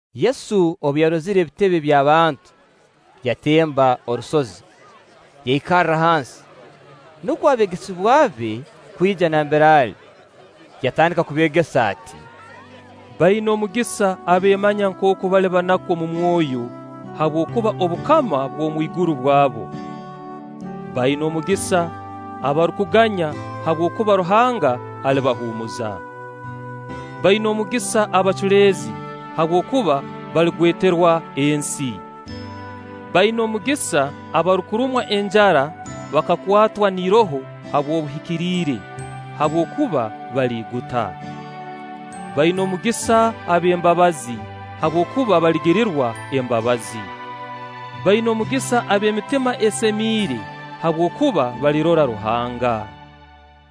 Yesu obu yarozire ebitebe by'abantu, yatemba orusozi, yaikarra hansi, nukwo abeegesebwa be kwija nambere ali, yatandika kubeegesa ati: “Baina omugisa abeemanya nkooku bali banaku omu mwoyo, habwokuba obukama bw'omwiguru bwabo. Baina omugisa abarukuganya, habwokuba Ruhanga alibahuumuza. Baina omugisa abaculeezi, habwokuba baligweterwa ensi. Baina omugisa abarukurumwa enjara bakakwatwa n'iroho habw'obuhikiriire, habwokuba baliiguta. Baina omugisa ab'embabazi, habwokuba baligirirwa embabazi. Baina omugisa ab'emitima esemiire, habwokuba balirora Ruhanga.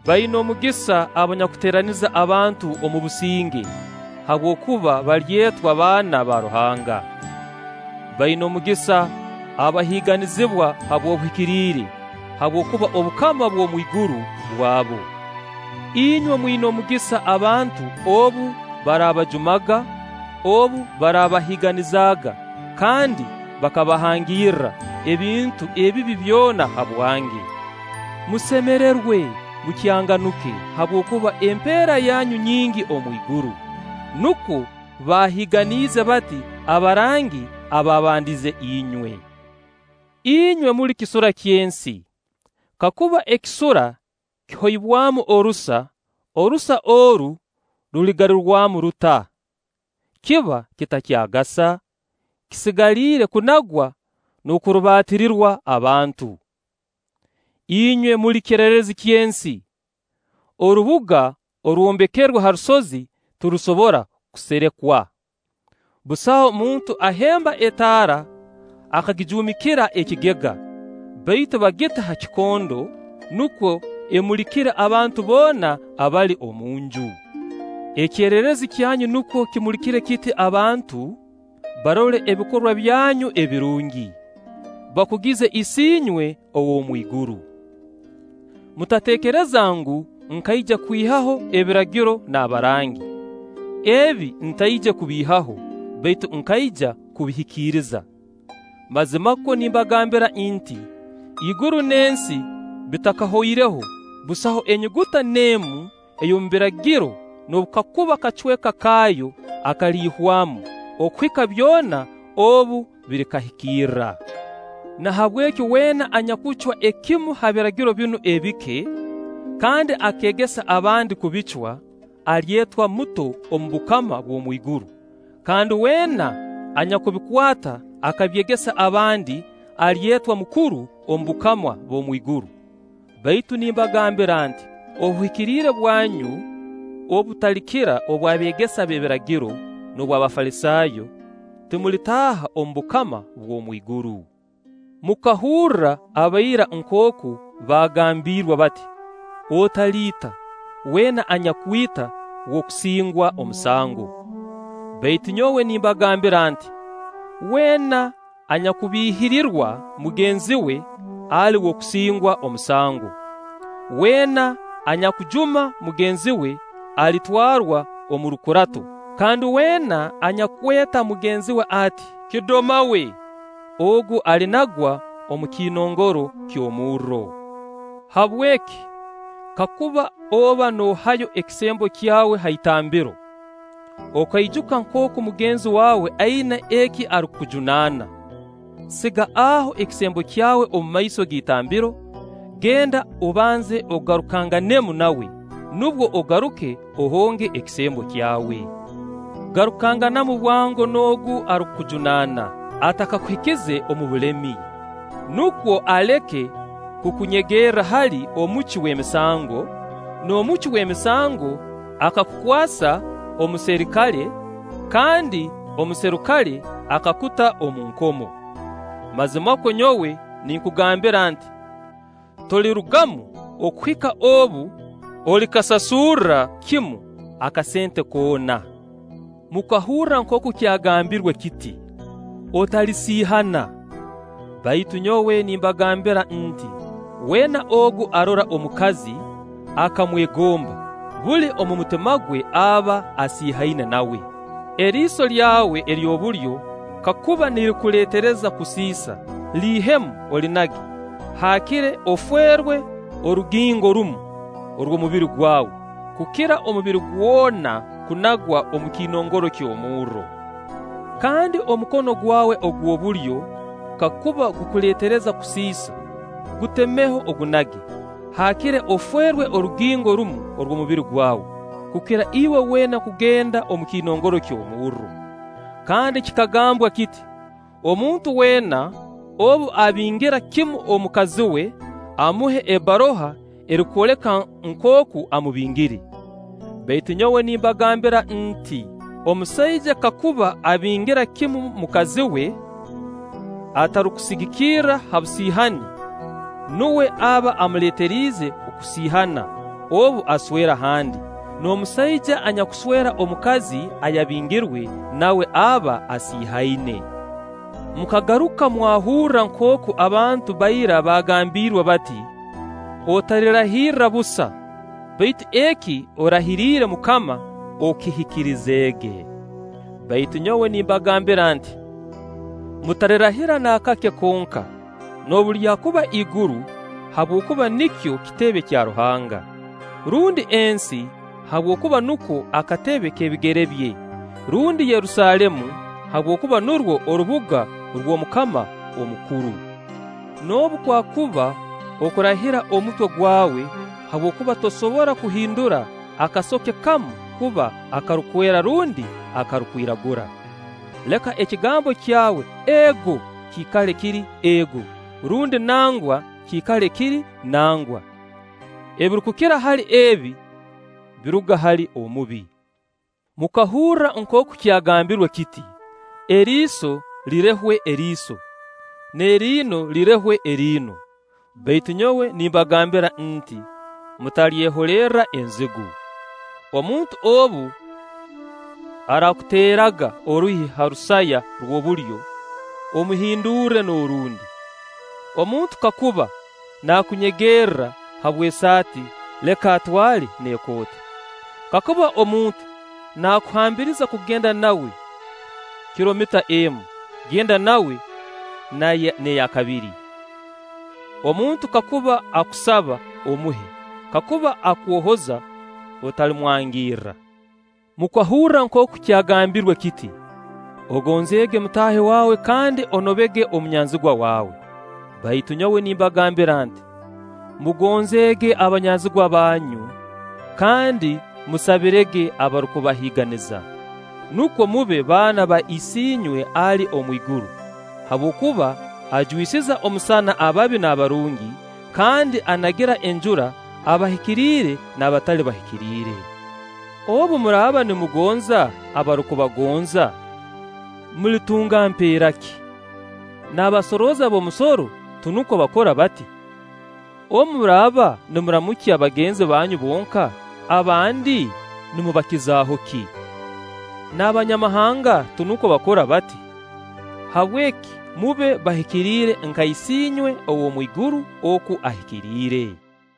Baina omugisa abanyakuteeraniza abantu omu businge, habwokuba balyetwa baana ba Ruhanga. Baina omugisa abahiiganizibwa habw'obuhikiriire, habwokuba obukama bw'omwiguru bwabo. Inywe mwina omugisa abantu obu baraabajumaga, obu baraabahiiganizaaga kandi bakabahangirra ebintu ebibi byona habwange. Musemererwe, mukyanganuke, habwokuba empeera yanyu nyingi omu iguru; nukwo baahiiganiize bati abarangi abaabandize inywe.” “Inywe muli kisura ky'ensi; kakuba ekisura kihoibwamu orusa, orusa oru ruligarurwamu ruta? Kiba kitakyagasa, kisigaliire kunagwa n'okurubaatirirwa abantu. “Inywe muli kyererezi ky'ensi. Orubuga orwombekerwe ha rusozi tirusobora kuserekwa. Busaho muntu ahemba etaara akagijuumikira ekigega, baitu bagita ha kikondo, nukwo emulikire abantu boona abali omu nju. Ekyererezi kyanyu nukwo kimulikire kiti abantu, barole ebikorwa byanyu ebirungi, bakugize Isiinywe ow'omu iguru.” “Mutateekereza ngu, nkaija kwihaho Ebiragiro n'abarangi. Ebi ntaije kubiihaho, baitu nkaija kubihikiriza. Mazimakwo nimbagambira nti: Iguru n'ensi bitakahoireho, busaho enyuguta n'emu ey'omu Biragiro noobu kaakuba kacweka kaayo akaliihwamu, okuhika byona obu birikahikirra. Nahabweki weena anyakucwa ekimu ha biragiro binu ebike, kandi akeegesa abandi kubicwa, alyetwa muto omu bukama bw'omwiguru; kandi weena anyakubikwata akabyegesa abandi, alyetwa mukuru omu bukama bw'omwiguru. Baitu nimbagambira nti: Obuhikiriire bwanyu obu butalikira obw'abeegesa b'ebiragiro n'obw'Abafalisaayo timulitaaha omu bukama bw'omwiguru.” “Mukahurra aba ira nkooku baagambiirwe bati: ‘Otaliita; weena anyakwita w'okusingwa omusango’. Baitu nyowe nimbagambira nti: Weena anyakubiihirirwa mugenzi we ali w'okusingwa omusango; weena anyakujuma mugenzi we alitwarwa omu rukurato; kandi weena anyakweta mugenzi we ati: ‘Kidoma we!’ ogu alinagwa omu kiinongoro ky'omurro. Habweki, kakuba oba noohayo ekisembo kyawe ha itambiro, okaijuka nkooku mugenzi waawe aina eki arukukujunaana, siga aho ekisembo kyawe omu maiso g'itambiro, genda obanze ogarukanganemu nawe, nubwo ogaruke ohonge ekisembo kyawe. “Garukanganamu bwango n'ogu arukujunaana, atakakuhikize omu bulemi; nukwo aleke kukunyegerra hali omucwi w'emisango, n'omucwi w'emisango akakukwasa omuserikale, kandi omuserikale akakuta omu nkomo. Mazimakwo nyowe ninkugambira nti: Tolirugamu okuhika obu olikasasurra kimu akasente koona.” “Mukahurra nkooku kyagambirwe kiti: ‘Otalisiihana’. Baitu nyowe nimbagambira nit: Weena ogu arora omukazi akamwegomba, buli omu mutima gwe aba asiihaine nawe. Eriiso lyawe ery'obulyo kakuba nirikuleetereza kusiisa, liihemu olinage; haakire ofeerwe orugingo rumu orw'omubiri gwawe, kukira omubiri gwona kunagwa omu kiinongoro ky'omurro. Kandi omukono gwawe ogw'obulyo kakuba gukuleetereza kusiisa, gutemeho ogunage; haakire ofeerwe orugingo rumu orw'omubiri gwawe, kukira iwe weena kugenda omu kiinongoro ky'omurro.” “Kandi kikagambwa kiti: ‘Omuntu weena obu abingira kimu mukazi we, amuhe ebbaruha erukwoleka nkooku amubingire.’ Baitu nyowe nimbagambira nti: Omusaija kakuba abingira kimu mukazi we, atarukusigikira ha busiihani, nuwe aba amuleeteriize kusiihana obu aswerwa handi; n'omusaija anyakuswera omukazi ayabingirwe, nawe aba asiihaine.” “Mukagaruka mwahurra nkooku abantu ba ira bagambiirwe bati: ‘Otalirahirra busa, baitu eki orahiriire MUKAMA okihikirizeege!’ Baitu nyowe nimbagambira nti: Mutalirahira naakake konka, noobu lyakuba iguru, habwokuba nikyo kitebe kya Ruhanga; rundi ensi, habwokuba nuko akatebe k'ebigere bye; rundi Yerusaalemu, habwokuba nurwo orubuga rw'Omukama omukuru. Noobu kwakuba okurahira omutwe gwawe, habwokuba tosobora kuhindura akasoke kamu kuba akarukwera rundi akarukwiragura. Leka ekigambo kyawe ‘Ego’ kiikale kiri ‘Ego’, rundi ‘Nangwa’ kiikale kiri ‘Nangwa?’; ebirukukira hali ebi biruga hali Omubi.” “Mukahurra nkooku kyagambirwe kiti: ‘Eriiso lirehwe eriiso, n'eriino lirehwe eriino.’ Baitu nyowe nimbagambira nti: mutalyeholerra enzigu. Omuntu obu araakuteeraga oruhi ha rusaya rw'obulyo, omuhindurre n'orundi. Omuntu kakuba nakunyegerra habw'esaati, leka atwale n'ekooti. Kakuba omuntu naakuhambiriza kugenda nawe kilomita emu, genda nawe n'eya kabiri. Omuntu kakuba akusaba, omuhe; kakuba akwohoza, otalimwangirra.” “Mukahurra nkooku kyagambirwe kiti: ‘Ogonzeege mutaahi waawe kandi onobege omunyanzigwa waawe’. Baitu nyowe nimbagambira nti: Mugonzeege abanyanzigwa banyu, kandi musabirege abarukubahiiganiza, nukwo mube baana ba Isiinywe ali omu iguru, habwokuba ajwisiza omusana ababi n'abarungi, kandi anagira enjura abahikiriire n'abatali bahikiriire. Obu muraaba nimugonza abarukubagonza, mulitunga mpeera ki? N'abasorooza b'omusoro tinukwo bakora bati? Obu muraaba nimuramukya bagenzi banyu bonka, abandi nimubakizaaho ki? N'Abanyamahanga tinukwo bakora bati? Habweki mube bahikiriire nka Isiinywe ow'omu iguru oku ahikiriire.”